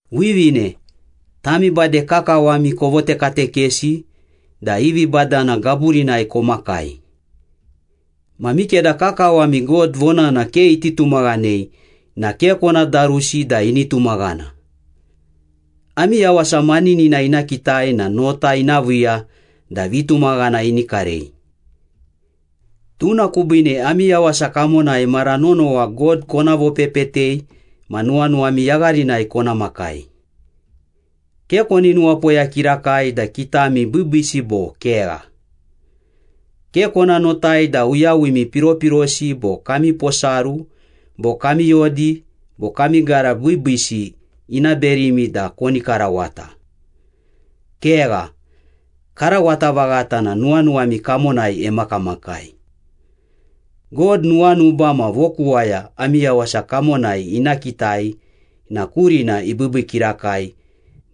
Wivine, tami bade kakawami kovotekatekesi da i vibadana gaburinai komakai. Ma mikeda kakawami God vonana ke iti tumaghanei na ke kona darusi da ini tumaghana. Ami yawasa maninina ina kitai na nota ina viiya da vitumaghana ini karei. Tuna kubiine ami yawasa kamonai mara nonowa God kona vopepetei ma nuwanuwami yagharinai kona makai. Ke koni nuwapoya kirakai da kitami biibiisi bo kegha. Ke kona notai da uyawimi piropirosi bo kami posaru bo kami yodi bo kami gara biibiisi ina berimi da koni karawata. Kegha, karawata vaghata na nuwanuwami kamonai emakamakai. God nuwanuba ma vokuwaya ami yawasa kamonai ina kitai na kurina ibiibii kirakai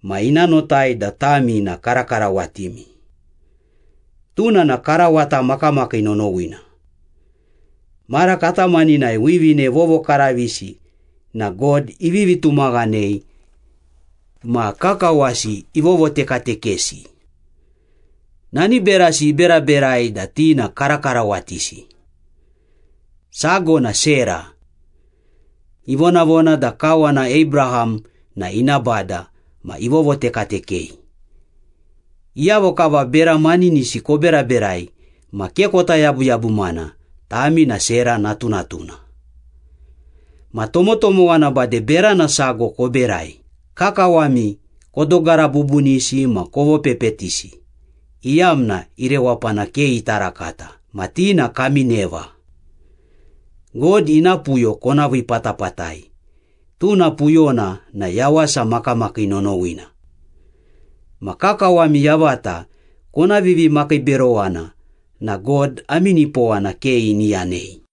ma ina notai da tami na karakarawatimi. Tuna na karawata makamakii nonowina. Mara katamaninai wivine vovokaravisi na God ivivi tumaghanei ma kakawasi ivovotekatekesi. Nani berasi iberaberai da ti na karakarawatisi. Sago na Sera. Ivonavona da kawana Abraham na ina bada ma ivovotekatekei. Iyavo kava bera maninisi koberaberai ma ke kota yabuyabumana, tami na Sera natunatuna. Ma tomotomowa na bade berana sago koberai, kakawami kodogara bubunisi ma kovopepetisi iyamna i rewapana ke ita rakata, ma ti na kami neva. God ina puyo kona vii patapatai, tuna puyona na yawasa makamakii nonowina. Ma kakawami yavata kona vivimakiiberowana na God ami nipowana ke ini yanei.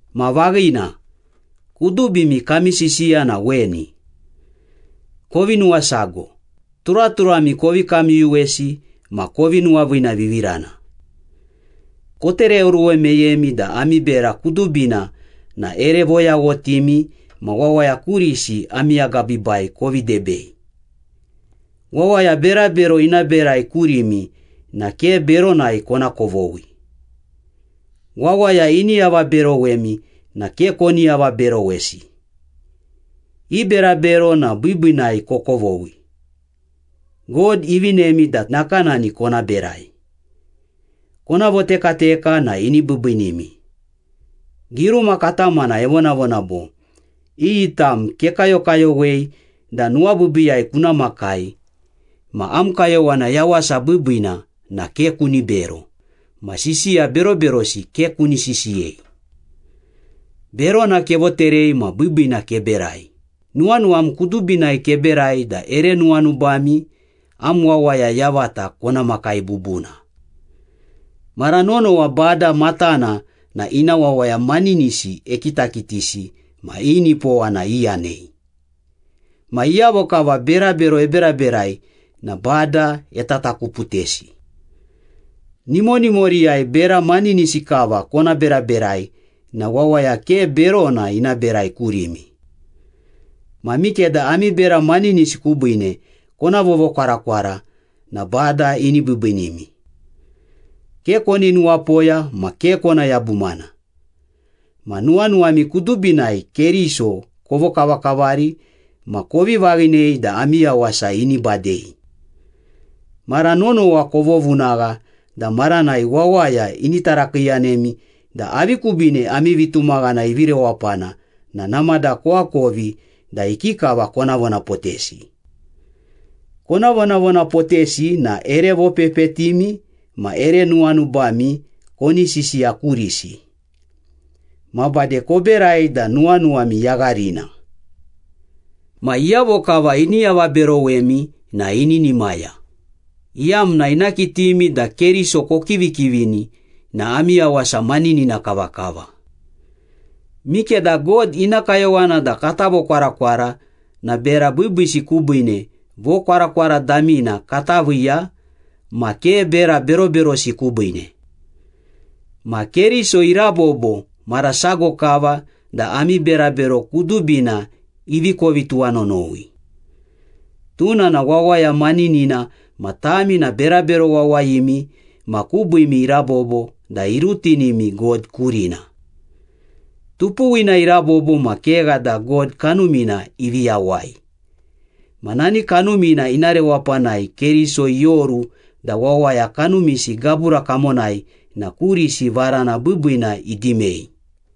Ma vaghina, kudubimi kami sisiya na weni. Kovi nuwasago, turaturami kovi kamyuyuwesi ma kovi nuwaviinavivirana. Kotereoruwe meyemi da ami bera kudubina na ere voyaghotimi ma wawaya kurisi ami agabiibai kovi debei. Wawaya berabero ina berai kurimi na ke beronai kona kovoghi. Wawaya ini avaberowemi na ke koni avaberowesi. I berabero na biibiinai kokovoghi. God ivinemi da nakanani kona berai. Kona votekateka na ini biibiinimi. Giruma katamana evonavona bo, “Iyi tam kekayokayowei da nuwabiibiiyai kuna makai, Ma am kayowana yawasa biibiina, na ke kuni bero, ma sisiya beroberosi ke kuni sisiyei. Berona kevoterei ma biibiina keberai, Nuwanuwam kudubinai keberai da ere nuwanubami am wawaya yavata kona makai bubuna. Mara nonowa Bada matana na ina wawaya maninisi ekitakitisi ma i nipowana iyanei. Ma iyavo kava berabero eberaberai na Bada etatakuputesi.” Nimonimoriyai bera maninisi kava kona beraberai na wawaya ke berona ina berai kurimi. Ma mikeda ami bera maninisi kubiine kona vovokwarakwara na Bada ini biibiinimi. “Ke koni nuwapoya ma ke kona yabumana.” Ma nuwanuwami kudubinai Keriso kovokavakavari ma kovi vaghinei da ami yawasa ini badei. Mara nonowa kovovunagha da maranai wawaya ini tarakiiyanemi da avi kubiine ami vitumaghana ivi rewapana na namada koakovi da ikikava kona vonapotesi. Kona vonavonapotesi na ere vopepetimi ma ere nuwanubami koni sisiya kurisi. Ma bade koberai da nuwanuwami yagharina. Ma iyavo kava ini avaberowemi na ininimaya, iyamna ina kitimi da Keriso kokivikivini na ami yawasa maninina kavakava. Mikeda God ina kayowana da kata vokwarakwara na bera biibiisi kubiine vokwarakwara damina kata viiya ma ke bera beroberosi kubiine. Ma Keriso irabobo mara sago kava da ami berabero kudubina ivi kovi tuwanonowi. Tuna na wawaya maninina ma tami na berabero wawayimi ma kubiimi irabobo da irutinimi God kurina. Tupuwina irabobo ma kegha da God Kanumina ivi yawai. Ma nani Kanumina ina rewapanai Keriso ioru da wawaya kanumisi gabura kamonai na kurisi varana biibiina idimei.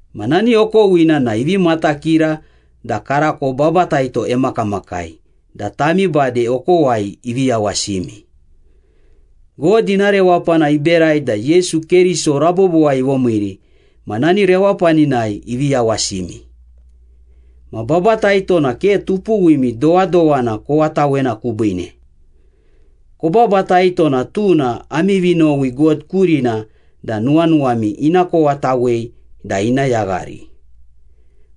Ma nani okowina na ivi matakira da karako babataito emakamakai da tami bade okowai ivi yawasimi. God ina rewapana iberai da Yesu Keriso rabobowai ivomiiri ma nani rewapaninai ivi yawasimi. Ma babataito na ke tupuwimi dowadowana kowatawena kubiine. Kobabataito na tuna ami vinowi God kurina da nuwanuwami ina kowatawei da ina yaghari.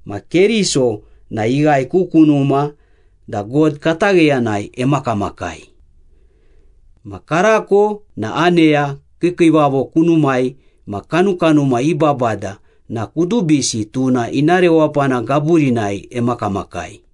Ma Keriso na ighae ku kunuma da God katagheyanai emakamakai. Ma karako na aneya, kiikiivavo kunumai ma kanukanuma i babada na kudubisi tuna ina rewapana gaburinai emakamakai.